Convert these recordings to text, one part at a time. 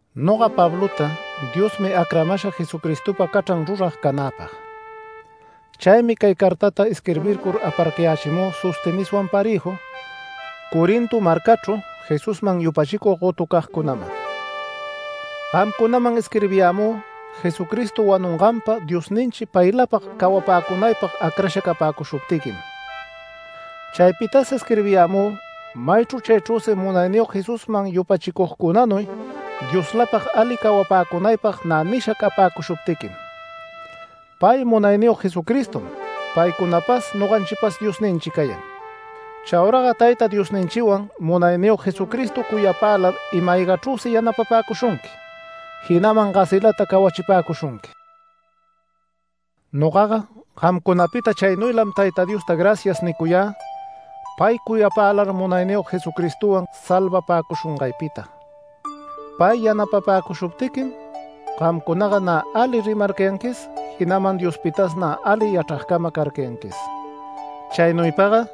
Noga Pablota Diosmi acramasha Jesucristopa cachran rurag canäpag. Chaymi cay cartata isquirbircur aparcayächimü Sosteneswan parëju Corinto marcachru Jesusman yupachicug gotucagcunaman. Gamcunaman isquirbiyämü Jesucristo wanunganpa Diosninchi paylapag cawapäcunaypag acrasha capäcushuptiquim. Chaypitas isquirbiyämü maychru chaychrüsi Munayniyog Jesusman yupachicugcunanuy Dioslapag ali cawapäcunaypag nä nisha capäcushuptiquim. Pay Munayniyog Jesucristom paycunapas noganchipas Diosninchi cayan. Chauraga Tayta Diosninchiwan Munayniyog Jesucristo cuyapälar ima-aygaychrüsi yanapapäcushunqui, jinaman gasilata cawachipäcushunqui. Nogaga gamcunapita chaynuylam Tayta Diosta “Gracias” nicuyä, pay cuyapälar Munayniyog Jesucristowan salvapäcushungaypita. Pay yanapapäcushuptiquim gamcunaga nä ali rimarcayanquis, jinaman Diospitas nä ali yachragcama carcayanquis. Chaynuypaga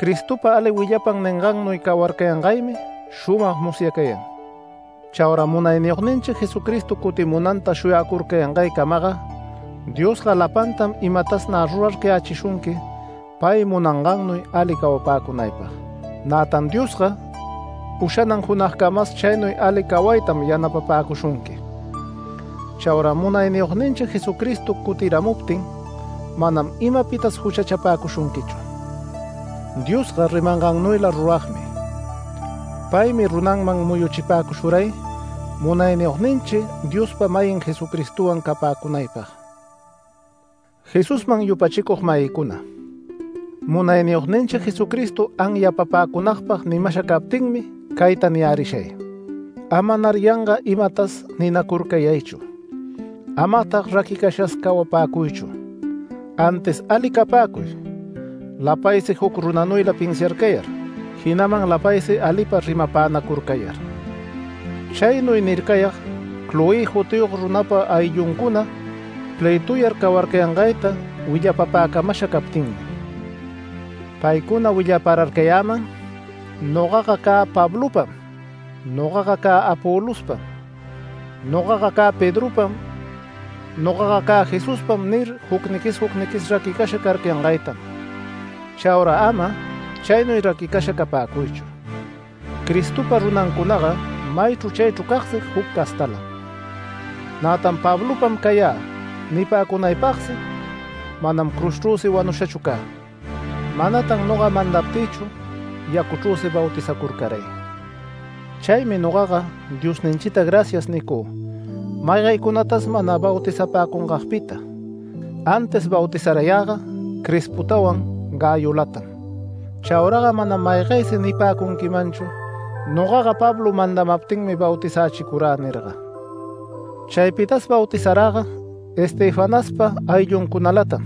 Cristopa ali willapan ningannuy cawarcayangaymi shumag musyacayan. Chaura Munayniyogninchi Jesucristo cutimunanta shuyacurcayangaycamaga, Diosga lapantam imatas nä rurarcayächishunqui pay munangannuy ali cawapäcunaypag. Nätan Diosga ushanan junagcamas chaynuy ali cawaytam yanapapäcushunqui. Chaura Munayniyogninchi Jesucristo cutiramuptin manam imapitas juchachapäcushunquichu. Diosga rimangannuyla ruragmi. Paymi runanman muyuchipäcushuray Munayniyogninchi Diospa-mayin Jesucristowan capäcunaypag. Jesusman yupachicug-mayïcuna, Munayniyogninchi Jesucristo anyapapäcunagpag nimasha captinmi cayta niyärishay: Amanar yanga imatas ninacurcayaychu. Amatag raquicashas cawapäcuychu. Antis ali capäcuy, lapaysi juc runanuyla pinsiarcayar, jinaman lapaysi alipa rimapänacurcayar. Chaynuy nircayag Cloé jutiyog runapa aylluncuna plëtuyar cawarcayangayta willapapäcamasha captinmi. Paycuna willapararcayäman “Nogaga cä Pablopam”, “Nogaga cä Apolospam”, “Nogaga cä Pedropam”, “Nogaga cä Jesuspam” nir jucniqui jucniquis raquicasha carcayangaytam. Chaura ama chaynuy raquicasha capäcuychu. Cristopa runancunaga maychru chaychru cagsi juc castalam, nätan “Pablopam cayä” nipäcunaypagsi manam cruzchrüsi wanushachu cä. Manatan noga mandaptïchu yacuchrüsi bautizacurcaray. Chaymi nogaga Diosninchita “Gracias” nicü maygaycunatas mana bautizapäcungagpita. Antis bautizarayäga Crispotawan Gayolatam. Chauraga manam maygaysi nipäcunquimanchu: “Nogaga Pablo mandamaptinmi bautizächicurä” nirga. Chaypitas bautizaräga Estefanaspa aylluncunalatam.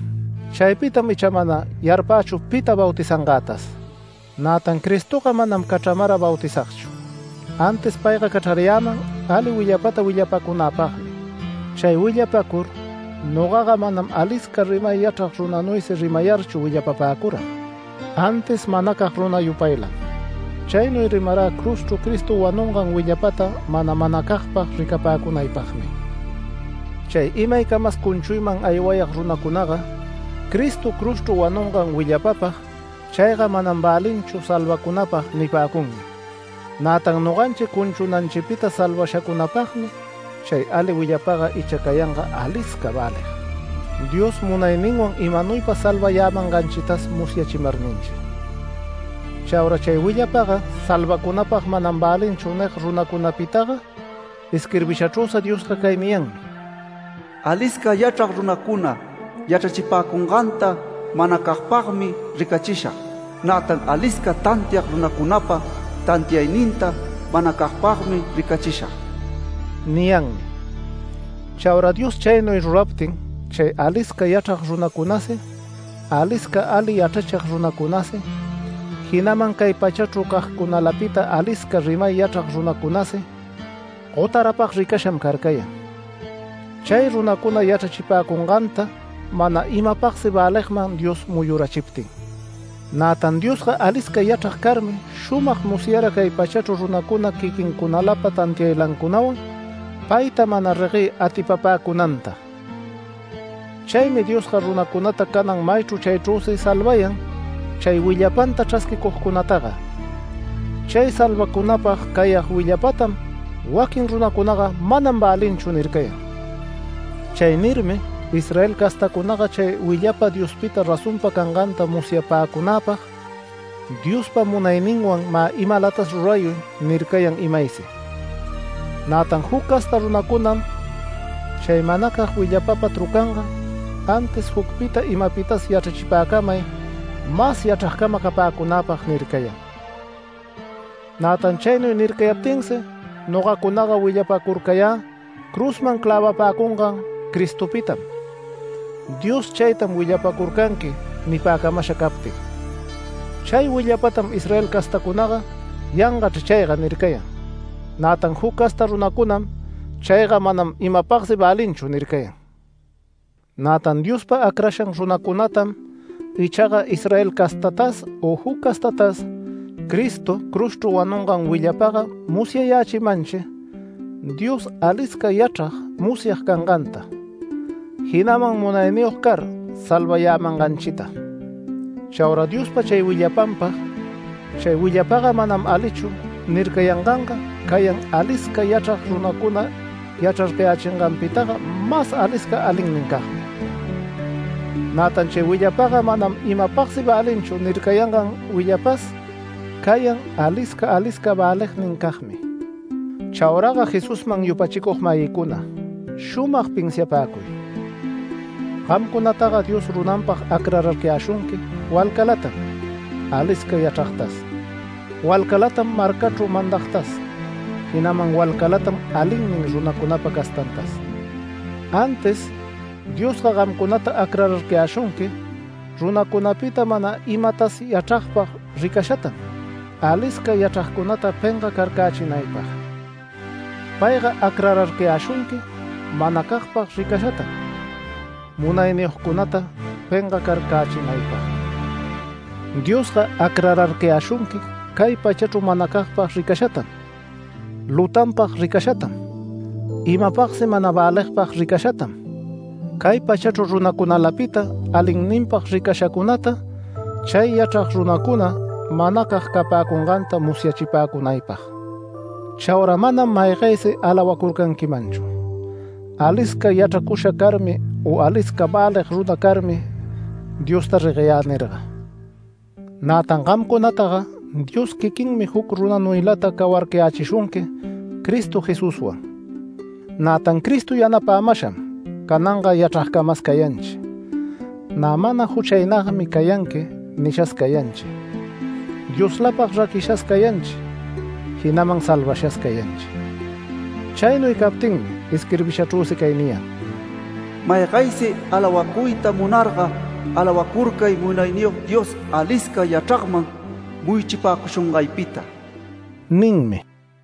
Chaypitam icha mana yarpächu pita bautizangätas. Nätan Cristoga manam cachramara bautizagchu, antis payga cachrarayäman ali willapata willapacunäpagmi. Chay willapacur nogaga manam alisca rimay yachrag runanuysi rimayarchu willapapäcururag, antis manacag runa yupaylam. Chaynuy rimarä cruzchru Cristo wanungan willapata mana manacagpag ricapäcunaypagmi. Chay imaycamas cunchuyman aywayag runacunaga Cristo cruzchru wanungan willapapag “Chayga manam välinchu salvacunapag” nipäcunmi. Nätan noganchi cunchunanchipita salvashacunapagmi chay ali willapaga icha cayanga alisca välig, Dios munayninwan imanuypa salvayämanganchitas musyachimarninchi. “Chaura chay willapaga salvacunäpag manam välinchu” nig runacunapitaga, isquirbishachrüsi Diosga cay niyanmi: “Alisca yachrag runacuna yachrachipäcunganta manacagpagmi ricachishag, nätan alisca tantiag runacunapa tantiayninta manacagpagmi ricachishag” niyanmi. Chaura Dios chaynuy ruraptin, chay alisca yachrag runacunasi, alisca ali yachrachig runacunasi, jinaman cay pachachru cagcunalapita alisca rimay yachrag runacunasi gotarapag ricasham carcayan. Chay runacuna yachrachipäcunganta mana imapagsi väligman Dios muyurachiptin. Nätan Diosga alisca yachrag carmi shumag musyara cay pachachru runacuna quiquincunalapa tantiaylancunawan payta mana reguey atipapäcunanta. Chaymi Diosga runacunata canan maychru chaychrüsi salvayan chay willapanta chrasquicugcunataga. Chay salvacunapag cayag willapatam waquin runacunaga “Manam välinchu” nircayan. Chay nirmi Israel castacunaga chay willapa Diospita razonpa canganta musyapäcunäpag “Diospa munayninwan mä imalatas rurayuy” nircayan imaysi, nätan juc casta runacunam, chay manacag willapapa trucanga, antis “Jucpita imapitas yachrachipäcamay mas yachragcama capäcunäpag” nircayan. Nätan chaynuy nircayaptinsi nogacunaga willapacurcayä cruzman clävapäcungan Cristopitam. Dios “Chaytam willapacurcanqui” nipäcamasha captin. Chay willapatam Israel castacunaga “Yangachr chayga” nircayan. Nätan juc casta runacunam “Chayga manam imapagsi välinchu” nircayan. Nätan Diospa acrashan runacunatam ichaga Israel castatas u juc castatas, Cristo cruzchu wanungan willapaga musyayächimanchi Dios alisca yachrag musyag canganta, jinaman munayniyog car salvayämanganchita. Chaura Diospa chay willapanpag: “Chay willapaga manam alichu” nircayanganga cayan alisca yachrag runacuna yachrarcayächinganpitaga mas alisca alinnincagmi. Nätan “Chay willapaga manam imapagsi välinchu” nircayangan willapas cayan alisca alisca välignincagmi. Chauraga Jesusman yupachicug-mayïcuna shumag pinsiapäcuy: Gamcunataga Dios runanpag acrararcayäshunqui walcalatam alisca yachragtas, walcalatam marcachru mandagtas, jinaman walcalatam alinnin runacunapa castantas. Antis Diosga gamcunata acrararcayäshunqui runacunapita mana imatas yachragpag ricashatam, alisca yachragcunata pengacarcächinaypag. Payga acrarcayäshunqui manacagpag ricashatam munayniyogcunata pengacarcächinaypag. Diosga acrararcayäshunqui cay pachachru manacagpag ricashatam, lutanpag ricashatam, imapagsi mana väligpag ricashatam, cay pachachru runacunalapita alinninpag ricashacunata, chay yachrag runacuna manacag capäcunganta musyachipäcunaypag. Chaura manam maygaysi alawacurcanquimanchu “Alisca yachracusha carmi u alisca välig runa carmi Diosta regueyä” nirga. Nätan gamcunataga Dios quiquinmi juc runanuylata cawarcayächishunqui Cristo Jesuswan. Nätan Cristo yanapämasham cananga yachragcamas cayanchi, “Nä mana juchaynagmi cayanqui” nishas cayanchi, Dioslapag raquishas cayanchi, jinaman salvashas cayanchi. Chaynuy captinmi isquirbishachrüsi cay niyan: “Maygaysi alawacuyta munarga alawacurcay Munayniyog Dios alisca yachragman muyuchipäcushungaypita” ninmi.